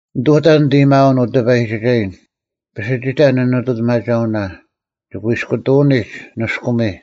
ᓂᑐᑕ ᓂᑦ ᐊᔭᒥᐊᐅᓐ, ᐅ ᑕᐸᔨᒋᒐᔨᓐ, ᐱᓯᒋᑕ ᓂᓂᑐᑎᒪᒐᐅᓇ: ᒋᑯᐃᔅᑯᑐᐅᓂᒡ ᓂᔅᑯᒥ,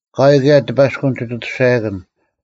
ᐊᑲᐎᔾ ᑭᔭ ᑎᐸᔅᑯᓐ ᒋᑦ ᐊᑐᔅᒐᔭᑭᓐ;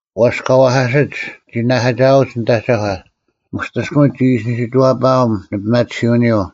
ᐛᔅ ᑲ ᐛᐧᑲᓯᒡ ᒋ ᓂᓇᐧᑲᒋᐊᐅᒡ ᓂᑦ ᐊᒐᒂ: ᒧᔅᑎᔅᑭᒥᒡ ᒋ ᐃᓯ ᓂᓯᐛᐸᐊᒻ ᓂᐱᒪᑎᓯᐅᓂᔪᐤ: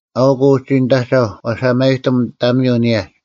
ᐊᐅᒄ ᐅᒋ ᓂᑦ ᐊᒐᐧᒄ ᐛᓴᒪᔨᑎᒻ ᑕᒥᔪᐤ ᓂᔭᒡ: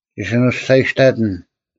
ᒋ ᓱᓂᔅᒐᔨᔅᑕᑎᓐ;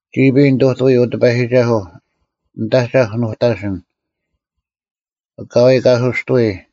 ᒋᐱᔾ ᓂᑐᑐᐎ, ᐅ ᑎᐸᔨᒋᒐᓱᐤ: ᓂᑦ ᐊᒐᐧᒄ ᓄᑕᓯᓐ: ᐊᑲᐎᔾ ᑲᓱᔅᑐᐎᔾ;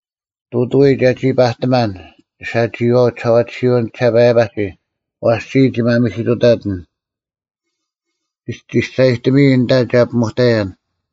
ᑐᑐᐎ ᒐᒋ ᐸᑎᒪᓐ ᒋᓴᒋᐃᐛᐤ ᒋᓴᐛᑎᓯᐅᓐ ᒋᔭᒋᓴᐸᔭᒋ; ᐛᔅ ᒋᔾ ᒋ ᒪᒥᓯᑐᑕᑎᓐ; ᒋᔅᒐᔨᑎᒥᐃ ᐊᓐᑕ ᒐ ᐱᒧᑕᔭᓐ;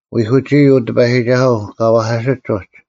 ᐎᐧᑯᒋᐃ, ᐅ ᑎᐸᔨᒋᒐᓱᐤ, ᑲ ᐛᐧᑲᓯᒡ ᐅᒡ: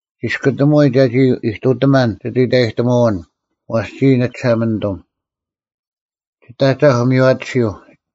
ᒋᔅᑯᑎᒧᐎ ᒐᒋ ᐃᑐᑎᒪᓐ ᒋᑦ ᐃᑕᔨᑎᒧᐅᓐ; ᐛᔅ ᒋᔾ ᓂᒋᓴᒪᓂᑐᒻ: ᒋᑦ ᐊᒐᐧᒄ ᒥᔽᑎᓯᐤ,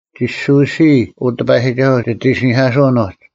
ᒋᓯᐎᓯᐃ, ᐅ ᑎᐸᔨᒋᒐᓱᐤ, ᒋᑦ ᐃᓯᓂᐧᑲᓱᐅᓐ ᐅᒡ: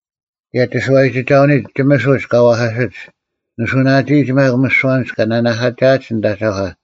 ᑭᔭ ᒋᓱᐛᔨᒋᒐᐅᓂᒡ ᒋᒥᓱᒡ ᑲ ᐛᐧᑲᓯᒡ, ᓂᓱᐅᓇᒋᐃᒡ ᒪᒃ ᒥᓯᐛ ᐊᓐᒡ ᑲ ᓇᓇᐧᑲᒋᐊᒡ ᓂᑦ ᐊᒐᒂ;